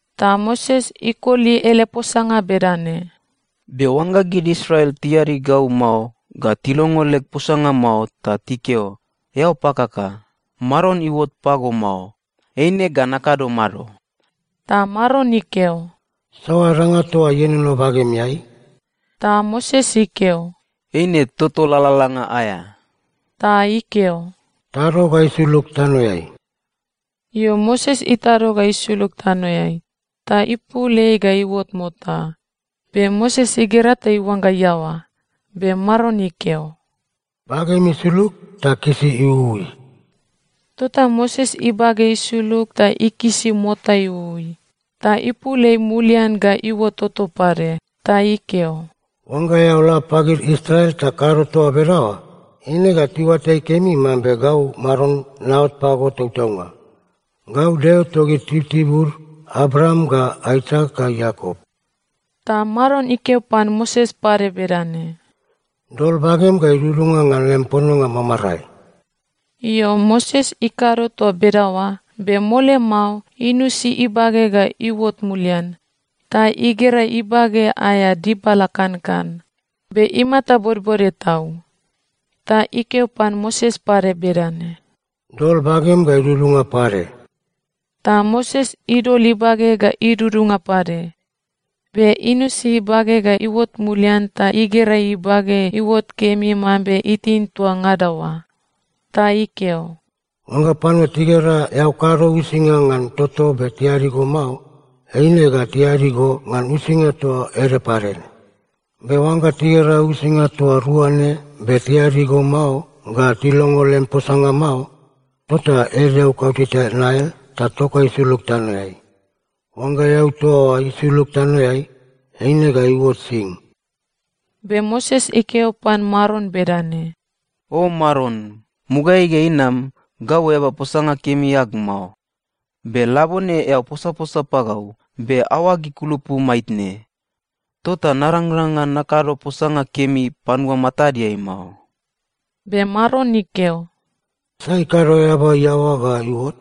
Ta Moses ikoli ele posanga bedane, “Be oangga gid Israel tiadi gau mao ga tilongo leg posanga mao ta tikeo, ‘Eao pakaka. Maron iuot pago mao,’ eine ga nakado mado?” Ta Maron ikeo, “Saoa danga toa ienono bagemeai?” Ta Moses ikeo, “Eine toto lalalanga aea.” Ta ikeo, “Tado ga isulug tanoeai.” Io, Moses itado ga isulug tanoeai, ta ipul ei ga iuot mota. Be Moses igera ta iuangga iaoa. Be Maron ikeo, “Bagem isulug ta kisi iuui.” Tota Moses ibage isulug ta ikisi mota iuui, ta ipul ei mulian ga iuot toto pade. Ta ikeo, “Oangga eao la pagid Israel ta kado toa bedaoa, eine ga tiuatai kemi mambe gau Maron naot pago tautaunga. Gau Deo togid tibutibud Abraam ga Aisak ga Iakop.” Ta Maron ikeo pan Moses pade bedane, “Dol bagem ga idudunga ngan lem pononga mamarae.” Io, Moses ikado toa bedaoa, be mole mao inusi ibage ga iuot mulian, ta igera ibage aea dibala kankan, be imata bodbode tau. Ta ikeo pan Moses pade bedane, “Dol bagem ga idudunga pade.” Ta Moses idol ibage ga idudunga pade, be inusi ibage ga iuot mulian ta igera ibage iuot kemi mambe itin toa ngada oa. Ta ikeo, “Oangga panua tigera eao kado uisinga ngan toto be tiadi go mao, eine ga tiadi go ngan uisinga toa ede pade ne. Be oangga tigera uisinga toa rua ne be tiadi go mao ga tilongo lem posanga mao, tota ed eau kauteta Nail ta tok ga isulug tanoeai. Oangga eau toa oa isulug tanoeai, eine ga iuot sing.” Be Moses ikeo pan Maron bedane, “O Maron, mugaeai ga inam, gau eaba posanga kemi ag mao. Be labone eao posaposa pagau, be aoag ikulupu maitne. Tota narangrang ngan nakado posanga kemi panua matadeai mao.” Be Maron ikeo, “Sai ikado eaba iaoa ga iuot?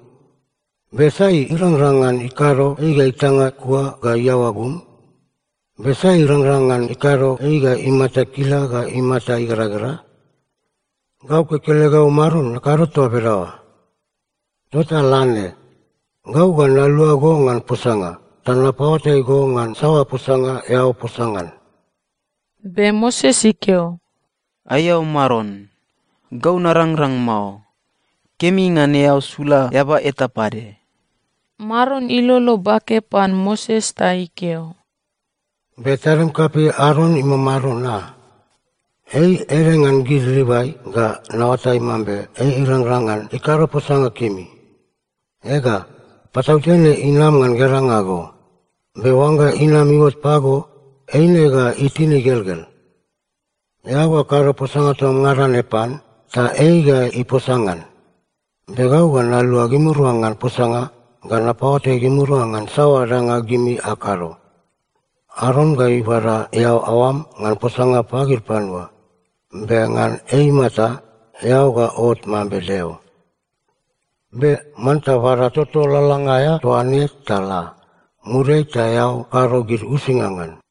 Be sai irangrang ngan ikado ei ga itanga kua ga iaoa gum? Be sai irangrang ngan ikado ei ga imata ikila ga imata igeragera? Gau kekelegau Maron, nakado toa bedaoa. Tota la ne. Gau ga nalua go ngan posanga, ta napaoatai go ngan saoa posanga eao posa ngan.” Be Moses ikeo, “Aiao Maron. Gau narangrang mao. Kemi ngan eao sula eaba eta pade.” Maron ilolo bake pan Moses ta ikeo, “Be tadim kapei Aron imamado, na? Ei ede ngan gid Livai, ga naoatai mambe ei irangrang ngan ikado posanga kemi. Ega, patautene inama ngan geranga go. Be oangga inama iuot pago, eine ga itin igelgel. Eao ga kado posanga toa ngada ne pan, ta ei ga iposa ngan. Be gau ga nalua gimirua ngan posanga ga napaoatai gimirua ngan saoa danga gimi akado. Aron ga ibada eao aoam ngan posanga pagid panua. Be ngan ei imata, eao ga ot mambe Deo. Be manta bada toto lalalanga aea toa ne ta la. Muriai ta eao kado gid uisinga ngan.”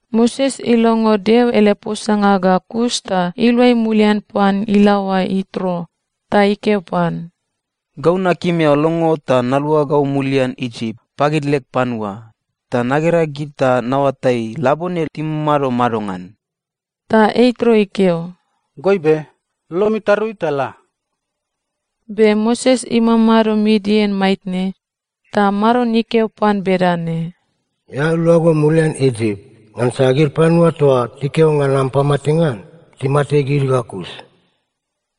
Moses ilongo Deo ele posanga ga kus ta iluai mulian pan ilaoa Ietro ta ikeo pan, “Gau nakim eao longo ta naluagau mulian Isip, pagid leg panua, ta nagera gid ta naoatai, labone timamado madongan.” Ta Ietro ikeo, “Goibe. Lolom itarui ta la.” Be Moses imamado Midian maitne, ta Maron ikeo pan bedane, “Eao luago mulian Isip. Ngansa gid panua toa tikeo ngan am pamatenga, timate gid ga kus.”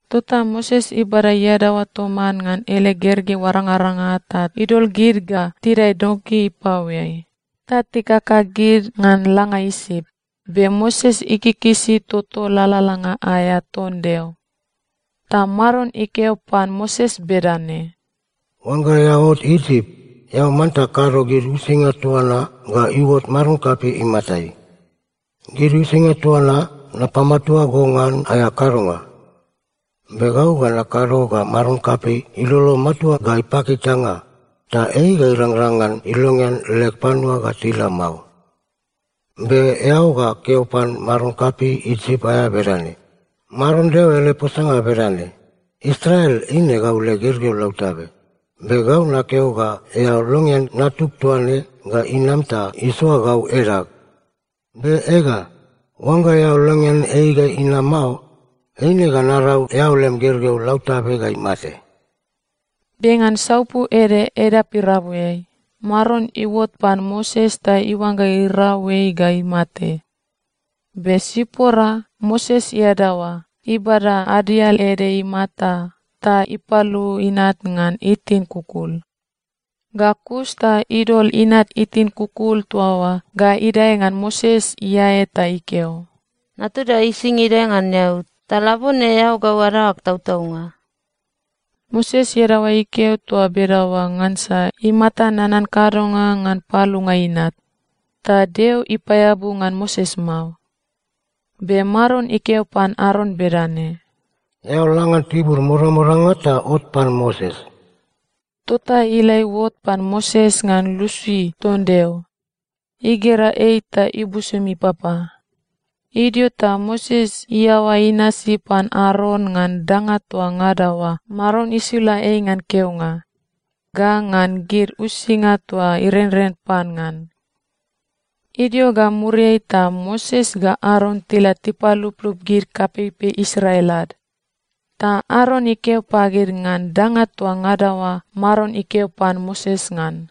Tota Moses ibada iadaoa toman ngan ele gergeu arangaranga ta idol gid ga tidae donki ipaoeai, ta tikaka gid ngan langa Isip. Be Moses ikikisi toto lalalanga aea ton Deo. Ta Maron ikeo pan Moses bedane, “Oangga eao ot Isip, eao manta kado gid uisinga toa na ga iuot maron kapei imatai. Gid uisinga toa na, napamatua go ngan aea kadonga. Be gau ga nakado ga maron kapei ilolo matua ga ipaki itanga, ta ei ga irangrang ngan ilongean leg panua ga tila mao. Be eao ga keo pan maron kapei Isip aea bedane, ‘Maron Deo ele posanga bedane: Israel eine gau leg gergeu lautabe. Be gau nakeo ga eao longean natug toa ne ga inam ta isoa gau edag. Be ega, oangga eao longean ei ga inama mao, eine ga narau eao lem gergeu lautabe ga imate.’” Be ngan saupu ede edap irabuiai, Maron iuot pan Moses ta iuangga irau ei ga imate. Be Sipora, Moses iadaoa, ibada adial ede imata ta ipalu inat ngan itin kukul. Ga kus ta idol inat itin kukul toa oa ga idae ngan Moses iae ta ikeo, “Natuda ising idae ngan eao, ta labone eao gau adaoag tautaunga.” Moses iadaoa ikeo toa bedaoa ngansa imata nanan kadonga ngan palunga inat. Ta Deo ipaeabu ngan Moses mao. Be Maron ikeo pan Aron bedane, “Eao la ngan tibur modamodanga ta ot pan Moses.” Tota ila iuot pan Moses ngan lusi ton Deo. Igera ei ta ibusum ipapa. Idio ta Moses iaoa inasi pan Aron ngan danga toa ngada oa Maron isula ei ngan keonga ga ngan gid uisinga toa irenren pan ngan. Idio ga muriai ta Moses ga Aron tila tipaluplup gid kapeipei Israel ad. Ta Aron ikeo pagid ngan danga toa ngada oa Maron ikeo pan Moses ngan.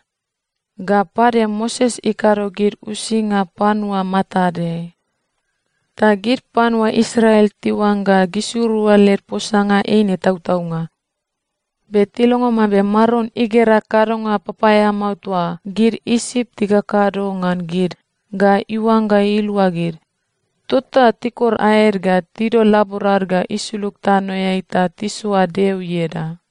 Ga pade Moses ikado gid uisinga panua matadeai. Ta gid panua Israel tiuangga gisirua led posanga eine tautaunga. Be tilongo mambe Maron igera kadonga papaeamao toa gid Isip tikakado ngan gid ga iuangga ilua gid, tota tikor aed ga tidol laborad ga isulug tanoeai ta tisoa Deo ieda.